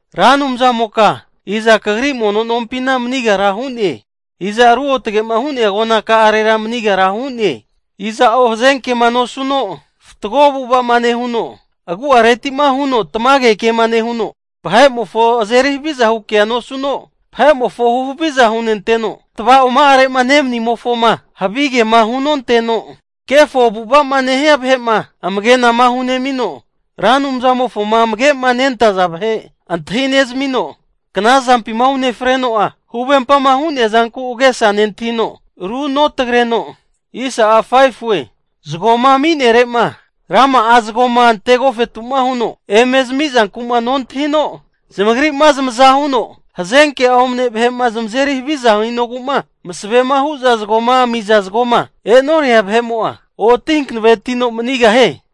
Ra Anumzamoka, iza kagri mono nompina manigara hu'ne? Iza ruotgema hu'nea agona ka'arera manigara hu'ne? Iza'o hazenkema nosuno fatgo avu'ava'ma nehuno, agu'aretima huno tamage kema nehuno, vahe'mofo azeri haviza hu kea nosuno, vahe'mofo huhaviza hunenteno, tavaoma'are'ma nemanimofoma havigema hunonteno, kefo avu'ava'ma nehia vahe'ma amagena hunemino, Ra Anumzamofoma amagema nentaza vahe antahine'zamino, knazampina unefreno'a, huvempama hu'nea zanku agesa nentahino runotagreno, zagoma ami'nerema, rama'a zagoma ante agofetu'ma huno eme zamizanku'ma nontahino, zamagri'ma zamaza huno hazenke'a omane vahe'ma zamazeri haviza hinogu'ma masavema hu'za zagoma amiza zagoma e'noria vahe'mo'a, oti hankanavetino manigahie.